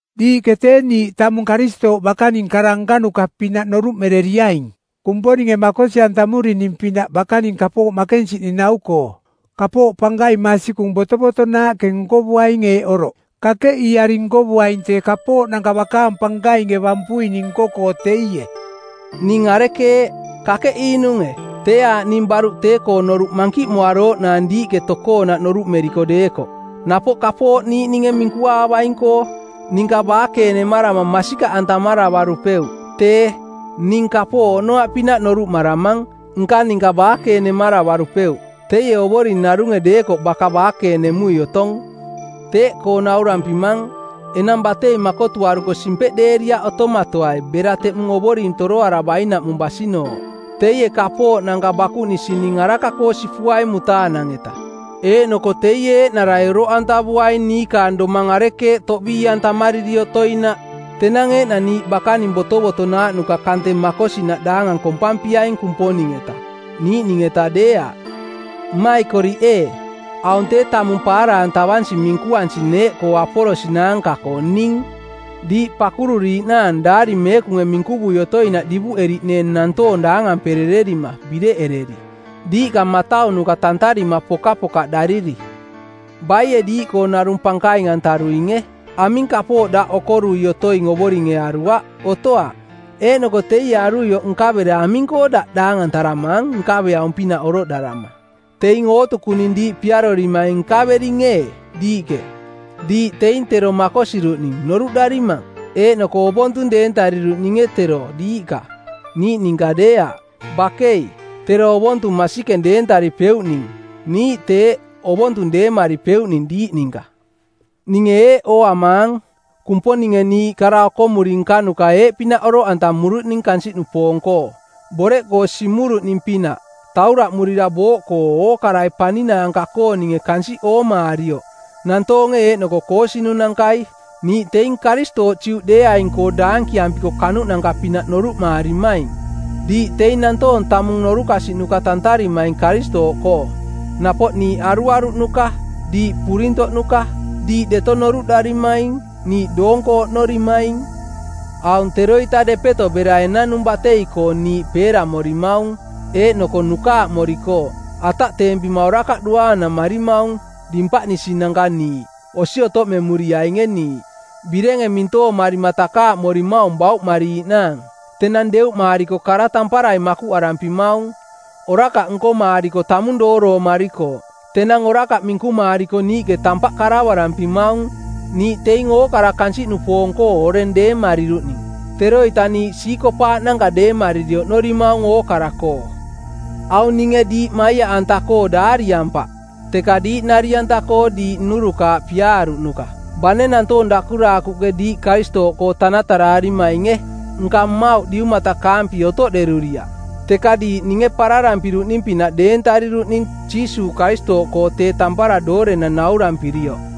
Diiꞌke tee niiꞌ tamung Karistooꞌ bakaning kara nkanuka-pinaꞌ noruꞌmereriaing Kumponinge makosi-antamurining-pinaꞌ bakaning kapooꞌ makensiꞌning nau-koo. Kapooꞌ pankaing masikung botovotonaaꞌke nkovuaing eeꞌ oroꞌ: Kakeꞌiiari nkovuaing tee kapooꞌnanka bakaang pankainge bampuining nko-koo teie. Ning arekeeꞌ? Kakeꞌiinunge? Tee aaꞌ ning baruꞌ tee-koo noruꞌ mankiꞌmoarooꞌnaang diiꞌke tokoonaꞌ noruꞌmeriko deekoꞌ, napoꞌ kapooꞌ niiꞌnunge minkuvuaing-koo. Ninka baakeenemarama masikaꞌantamaravarupeuꞌ. Tee, ning kapooꞌ oꞌnoaꞌpinaꞌ noruꞌmaramang, nka ninka baakeenemaravarupeuꞌ. Teie Ovoring narunge deekoꞌ baka baakeenemui otong. Teeꞌkoo naurampimang, enang batei makotuaruko simpeꞌdeeriaꞌ otomatoai bera teꞌmung Ovoring toroaravainaꞌmung basinooꞌ. Teie kapooꞌnanka bakuꞌnisining araka-koo sipuaing mutaanang-eta, eeꞌnoko teie eeꞌnarai oroꞌantavuaing niikaang domang arekeeꞌ toꞌbii-antamariri otoinaꞌ. Tenang eeꞌnang niiꞌ bakaning botovotonaaꞌnuka kante makosinaꞌ daangang kompampiaing Kumponing-eta, niiꞌning-eta deeaꞌ. Mmaikoriꞌ ee, aung tee tamung paara-antavansi minkuansing neeꞌkoo Apolos naanka-koo ning, diiꞌ pakururiiꞌnaang Daari Meekunge minkuvui otoinaꞌ divuꞌeriꞌneeng nantoong daangamperererima bireꞌereri, diiꞌka mataunuka tantarima pokapokaꞌdariri. Baie diiꞌkoonarung pankaing-antaruinge? Aming kapooꞌ daꞌ okorui otoing Ovoringe aruaꞌ? Otoaꞌ. Eeꞌnoko teie aruioꞌ nkavera aming-koo daꞌ daangantaramaang nkaveaung-pinaꞌ oroꞌdarama? Teing ootukuning diiꞌ piarorimaing nkavering ee, diiꞌke? Diiꞌ teing tero makosiruꞌning noruꞌdarimang? Eeꞌnoko ovontung deentariruꞌninge tero diiꞌka, niiꞌ ninka deeaꞌ? Bakei, tero ovontung masikeng deentaripeuꞌning, niiꞌ teeꞌ, ovontung deemaripeuꞌning diiꞌ ninka. Ninge eeꞌ ooamaang: Kumponinge niiꞌ kara okomuri nkanuka eeꞌpinaꞌ oroꞌantamurining kansiꞌnupoong-koo: boreꞌkoo simuruꞌning-pinaꞌ, tauraꞌmurira booꞌkoo ookarai paninaanka-kooninge kansiꞌ oomaarioꞌ, nantoonge eeꞌnoko koosinunankai. Niiꞌ teing Karistooꞌ Juꞌdeeaing-koo daankiampiko kanuꞌnanka-pinaꞌ noruꞌmaarimaing; diiꞌ teing nantoong tamung norukasiꞌnuka tantarimaing Karistooꞌkoo. Napoꞌ niiꞌ aruaruꞌnuka; diiꞌ purintoꞌnuka. Diiꞌ deto noruꞌdaarimaing; niiꞌ doonko oꞌnorimaing. Aung teroita depeto bera enanung batei-koo niiꞌ peeramorimaung eeꞌnoko nukaaꞌmorikooꞌ. Ataꞌteempima orakaꞌ duaanamarimaung. Dimpaꞌnisinanka niiꞌ. Osi otoꞌmemuriainge niiꞌ. Birenge mintoomarima takaaꞌmorimaung bauꞌmariiꞌnaang. Tenang deuꞌmaariko kara tamparai makuꞌarampimaung. Orakaꞌ nkomaariko tamung dooroomarikooꞌ. Tenang orakaꞌ minkumaariko niiꞌke tampaꞌ karavarampimaung. Niiꞌ teing ookara kansiꞌnupoong-koo oreng deemariruꞌning. Teroita niiꞌ siikopaaꞌnanka deemariri oꞌnorimaung ookara-koo. Aung ninge diiꞌ maiaꞌanta-koo daariampaꞌ teka diiꞌ nari-anta-koo diiꞌ nnurukaaꞌ piaaruꞌnuka. Bane nantoong dakuraakuꞌke diiꞌ Karistooꞌkoo tanataraarimainge, nka mmauꞌ diumatakaampi otoꞌderuriaꞌ, teka diiꞌ ninge pararampiruꞌning-pinaꞌ deentariruꞌning Jiisuuꞌ Karistooꞌkoo tee tampara doorenang naurampirioꞌ.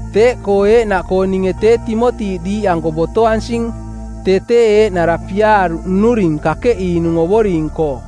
Teeꞌkoo eeꞌnaꞌkoo ninge tee Timoti diiꞌanko botoansing. Tee tee eeꞌnara piaaruꞌ nnuring kakeꞌiinung Ovoring-koo.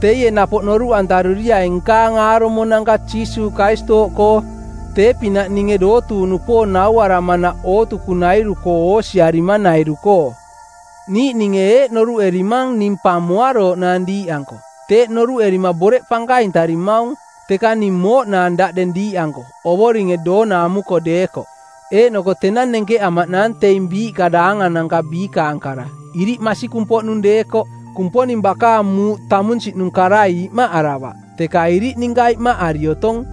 Teie napoꞌ noruꞌantaruriaing nkaang aarumonanka Jiisuuꞌ Karistooꞌkoo tee-pinaꞌ ninge dootuuꞌnupoong nauaramanaꞌ ootukunairu-koo oosiarimanairu-koo. Niiꞌninge eeꞌ noruꞌerimang ning pa moarooꞌnaang diiꞌanko. Teeꞌ noruꞌerima boreꞌ pankaintarimaung. Teka ning mooꞌnaang daꞌdeng diiꞌanko, Ovoringe doona amuko deekoꞌ. Eeꞌnoko tenang nenkeꞌamaꞌnaang teing biiꞌka daangananka biikaang kara, iriꞌ masikung-poꞌnung deekoꞌ. Kumponing bakaang muuꞌ tamunsiꞌnung karai imaꞌaravaꞌ, teka iriꞌ ninka imaꞌari otong.